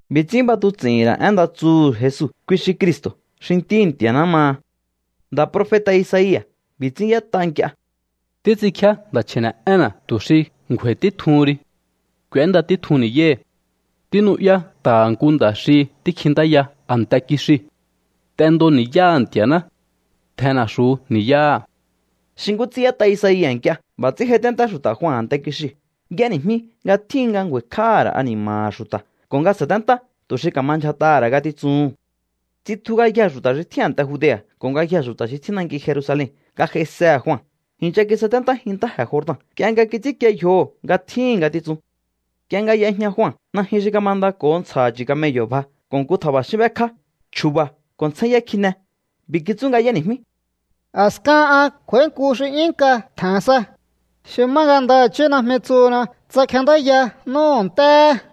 B'i̱ ts'ín b'atuts'i̱hi̱n ra̱ én nda tsuhu̱ Jesu, kui xi Cristo̱ xi Ntíhi̱ Nti̱a̱ná maha. Nda̱ profeta̱ Isaia̱ b'i̱ ts'ín y'ét'a nk'ie: Títs'inkjíá nda̱ chji̱ne̱'énna̱ tu̱ xi ngju̱a̱i̱ títjuhun ri. K'u̱énda títjun ni̱yáhi̱. Tínu'yá nta̱ha̱ nku nda̱ xi tíkjintáya a̱nte kixiu̱: “T'endo ni̱yáha̱ Nti̱a̱ná. Tjen na̱xu̱u ni̱yáha̱.” Xi nkú ts'ín y'ét'a Isaia̱ nk'ie, b'a̱ ts'ín j'aiténtá xu̱ta̱ Jua a̱nte kixiu̱. Y'éni̱jmí nga tjíhin nga ngju̱a̱i̱kj'áha̱ ra̱ ani̱ma̱ha̱ xu̱ta̱ ko̱ nga sa̱téntá tu̱ xi ka̱ma ndyjat'aha̱ ra̱ ngatitsuhu̱n. Tsitju ngayjee̱ xu̱ta̱ xi tjín a̱nte Judea̱ ko̱ ngayjee̱ xu̱ta̱ xi tjín nanki Jerusalen nga j'aisehe̱ Jua. I̱ncha kisaténtájin ntáje̱ Jordan nk'ie nga kits'ínkie yjoho̱ nga tjíhi̱n ngatitsun. Nk'ie nga y'ejña Jua, najyun xi kamandako̱ho ntsja̱ha̱ chu̱ camello̱ bja ko̱ nku tja̱ba̱xín b'ékjá. Chju̱ba̱ ko̱ ntsjényá kjine. B'i̱ kitsú nga y'éni̱jmí: —A̱skahan an kj'u̱a̱í nku xi 'yún nk'a tje̱n sa, xi má nga ndaha̱chí najmi tsuhuna tsa kjendáya n'úhu̱ ntéhe̱.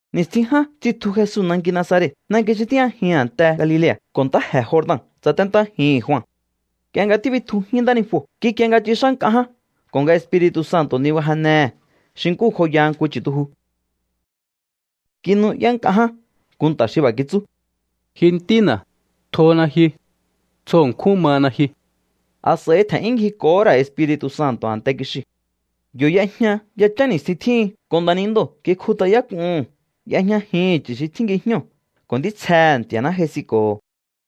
Ni̱stjin ján tsitju Jesu nanki Nazaret, nanki xi tíjñajihi̱n a̱nte Galilea̱, ko̱ ntáje̱ Jordan tsaténtájihi̱n Jua. Nk'ie nga tíbitjujín ntánijuo̱, kikie nga tsix'á nk'a ján ko̱ nga Espiri̱tu̱ Santo̱ nibajennehe̱ xi nkú joyaha nku chu̱tuju. Kinu'yá nk'a ján nku nta̱ xi b'a̱ kitsú: —Ji Ntína̱, tjona ji. Tsjo ṉkjún mana ji. A̱s'a̱i tje̱n'yún ngjiko̱hó ra̱ Espiri̱tu̱ Santo̱ a̱nte kixiu̱. Yo̱ y'ejña yachán ni̱stjin tjíhin, ko̱ nda̱nindoo̱ kikjut'ayák'uhu̱n. Y'ejñajihi̱n chu̱ xi tjín ngijñóo̱ ko̱ ntítsjehe̱ Nti̱a̱ná j'aisinko̱ho̱.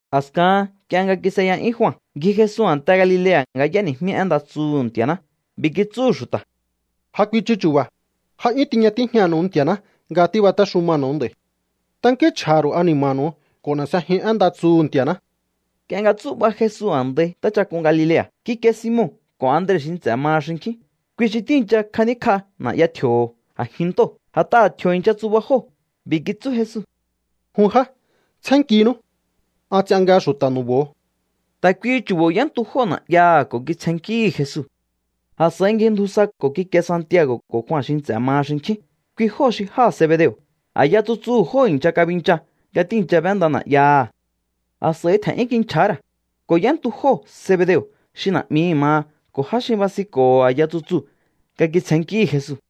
A̱skahan nk'ie nga kis'eya'yún Jua, ngji Jesu a̱nte Galilea̱ nga y'éni̱jmí én nda tsuhu̱ Nti̱a̱ná. B'i̱ kitsúhu̱ xu̱ta̱: —Ja kuichu chu̱ba̱. Ja 'yún tiña tíjñanu̱u Nti̱a̱ná nga tíbatéxumanu̱u nd'a̱i̱. Tankínchj'a̱ha̱ ru̱u ani̱ma̱nu̱u ko̱ n'e̱ s'ejiun én nda tsuhu̱ Nti̱a̱ná. Nk'ie nga tsú'ba Jesu a̱ndai ntáchak'un Galilea̱, kikie Simon ko̱ Andre xi nts'e̱ maha xinkjín. Kui xi tíi̱ncha kjaníkj'a na̱'ya tji̱o̱ho̱ a̱jin ntóo̱, a̱t'aha̱ tji̱o̱ i̱ncha tsuba jóo̱. B'i̱ kitsú Jesu: —Jun já, tsjénnkinú. An ts'ian nga xu̱ta̱ nu̱bo̱o. Ta̱ kuihi chu̱bo̱ y'éntu jóo̱ na̱'yaha̱ ko̱ kitsjennkíhi̱ Jesu. A̱s'a̱i ngjindju sa ko̱ kikie Santiago̱ ko̱ Jua xi nts'e̱ maha xinkjín. Kui jóo̱ xi jáha̱ Zebedeo̱. A̱yaha̱ tsutsuhu̱ jóo̱ i̱ncha kabincha nga tíi̱ncha b'énda na̱'yaha̱. A̱s'a̱i tje̱n'yún kinchja̱há ra̱, ko̱ y'éntu jóo̱ Zebedeo̱ xi na̱'mihi̱ maha ko̱ já xi basinko̱ho̱ a̱ya tsutsuu̱ nga kitsjennkíhi̱ Jesu.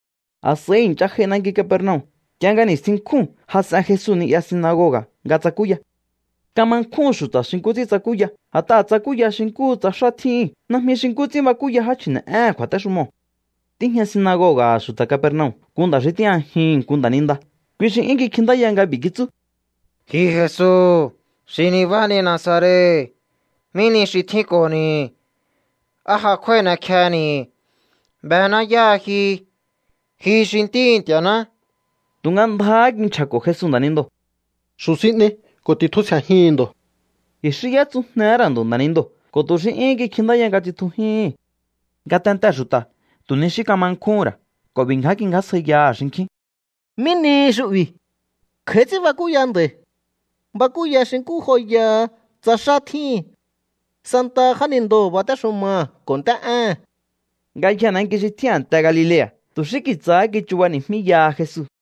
A̱s'a̱i i̱ncha j'ai nanki Capernaum. Nk'ie nga ni̱stjin nkjúu̱n jas'en Jesu ni'ya sinagoga̱ nga tsakúya. Kama nkjúhu̱n xu̱ta̱ xi nkú ts'ín tsakúya, a̱t'aha̱ tsakúya xi nkúhu tsa xá tjíhín, najmi xi nkú ts'ín bakúya já chji̱ne̱'éhe̱n kju̱a̱téxumoo̱. Tíjña sinagoga̱ha̱ xu̱ta̱ Capernaum nku nda̱ xi tíjñajihi̱n nku nda̱ninda. Kui xi 'yún kikjintáya nga b'i̱ kitsú: —Ji Jesu xi nibáhani Nazaret, ¿mí nihi xi tjínko̱ni̱? ¿Á ja kjúái̱ n'ekjehe̱ni̱? Bená yáha ji. Ji xi ntíhi̱ Nti̱a̱ná. Tu̱nga ndjáhá kinchja̱ko̱ Jesu nda̱nindoo̱: —¡Xu̱ sin n'ei ko̱ ti̱tjusje̱jihi̱n ndo̱! I̱xí y'étsujnehé ra̱ ndo̱ nda̱nindoo̱ ko̱ tu̱ xí 'yúhún kikjintáya nga tsitjujíhi̱n. Ngatentee̱ xu̱ta̱ tu̱ ni xí kama nkjúhún ra̱ ko̱ b'i̱ ngján kingjásjaiyaha̱ xinkjín: —¿Mí nihi xu'bi̱? Kj'a̱í ts'ín bakúya nda̱i̱. Bakúya xi nkú joyaha tsa xá tjíhi̱n. Santaha jánindoo̱ batéxumaha̱ ko̱ nt'é'éhe̱n. Ngayjee̱ nanki xi tjín a̱nte Galilea̱ tu̱ xí kitsahá kichubani̱jmíyaha Jesu.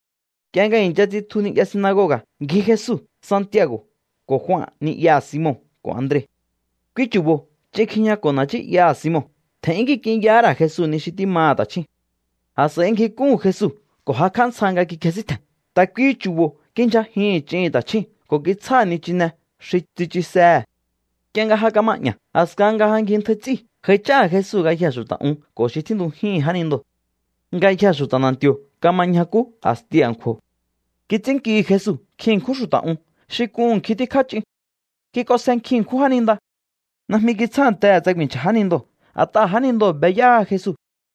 Nk'ie nga i̱ncha tsitju ni'ya sinagoga̱, ngji Jesu, Santiago̱ ko̱ Jua ni'yaha̱ Simon ko̱ Andre. Kui chu̱bo̱ ch'in kjijñako̱ na̱ nchí'yaha̱ Simon. Tje̱n'yún kik'inyahá ra̱ Jesu ni xi tímaha̱ ta̱chjúu̱n. A̱s'a̱i ngjik'úhu̱n Jesu ko̱ jakj'á ntsja nga kikjesíntje̱n. Ta̱ kuihi chu̱bo̱ kindyjajihi̱n ch'ihi̱n ta̱chjúu̱n ko̱ kitsjáha̱ nichine xi tsichusehe̱. Nk'ie nga ja kama'ña̱, a̱skahan nga ja ngjintjai ts'íu̱, j'aich'áha̱ Jesu ngayjee̱ xu̱ta̱ un ko̱ xi tjíntujíhi̱n jánindoo̱. Ngayjee̱ xu̱ta̱ na̱nti̱o̱ kama ñjakú a̱sti a̱nkju̱o̱. Kits'ínnkihi̱ Jesu nkjin ṉkjún xu̱ta̱ un xi k'uhu̱n nkjin tíkjá ch'in. Kik'onsje nkjin ṉkjún jáninda. Najmi kitsjántehe̱ tsa ku̱i̱nchja̱ jánindoo̱, a̱t'aha̱ jánindoo̱ be yáha Jesu.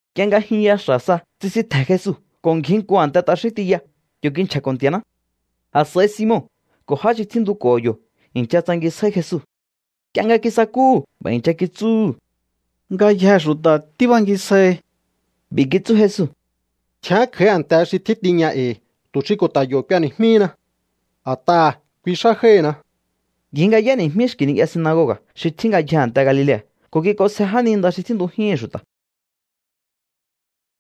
Nk'ie nga jyunya xa̱ sa, tsisintje̱n Jesu ko̱ ngji nku a̱nte t'axín tiya. Yo̱ kinchja̱ko̱ Nti̱a̱ná. A̱s'a̱i Simon ko̱ já xi tjíntuko̱ho̱ yo̱ i̱ncha tsangisjáí Jesu. Nk'ie nga kisakúhu̱, b'a̱ i̱ncha kitsúhu̱: —Ngayjee̱ xu̱ta̱ tíbangisjaihi. B'i̱ kitsú Jesu: —Tjián kj'a̱í a̱nte xi tjín tiña e̱i̱ tu̱ xi ko̱ ta̱ yo̱ k'ueni̱jmíhina. A̱t'aha̱ kui xá jáíhi̱na. Ngji nga y'éni̱jmí xki̱ ni'ya sinagoga̱ xi tjín ngayjee̱ a̱nte Galilea̱ ko̱ kik'onsje jáninda xi tjíntujíhi̱n xu̱ta̱.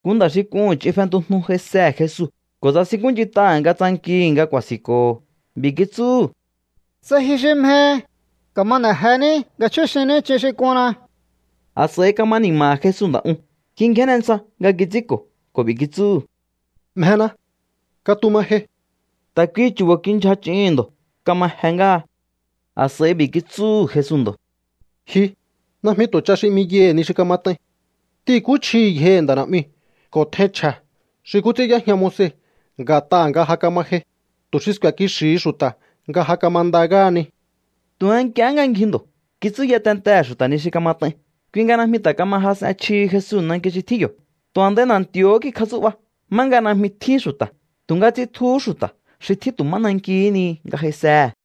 Nku nda̱ xi k'uhu̱n ch'in fentujnu j'aisehe̱ Jesu ko̱ tsasinkúnch'int'aha̱ nga tsankihi̱ nga ku̱a̱si̱nko̱ho̱. B'i̱ kitsúhu̱: —Tsa ji xi mjehi, ka̱ma n'e̱ jení nga chjúxinní ch'in xi k'unna. A̱s'a̱i kama ni̱ma̱ha̱ Jesu nda̱ uu̱n. Kingjénne ntsja nga kits'ínko̱ ko̱ b'i̱ kitsúhu̱: —Mjena. Katuma jei. Ta̱ kuihi chu̱bo̱ kindyja ch'ihi̱n ndo̱. Kama je ngáha. A̱s'a̱i b'i̱ kitsúhu̱ Jesu ndo̱: —Ji, najmi tu̱ ch'a xi 'miyaihi̱ ni xi kamat'ain. T'ihi̱nkúchjihi̱ yjohi̱ nda̱ na̱'miu̱ ko̱ tjein chje̱ xi nkú ts'ín y'éjña Moise nga̱t'aha̱ nga ja kama jei, tu̱ xi sku̱e̱ kixi̱hi xu̱ta̱ nga ja kamanda ngáhani. Tu̱nga nk'iehé nga ngji ndo̱, kitsúya tentehe̱ xu̱ta̱ ni xi kamat'ain. Kui nga najmi ta̱ kama jas'en chjihi Jesu nanki xi tjíhin yo̱. Tu̱ a̱ndai na̱nti̱o̱hó kikjatsú'ba má nga najmi tjín xu̱ta̱. Tu̱nga tsitjuhú xu̱ta̱ xi tjín tu̱ má nankihí ni nga j'aisehe̱.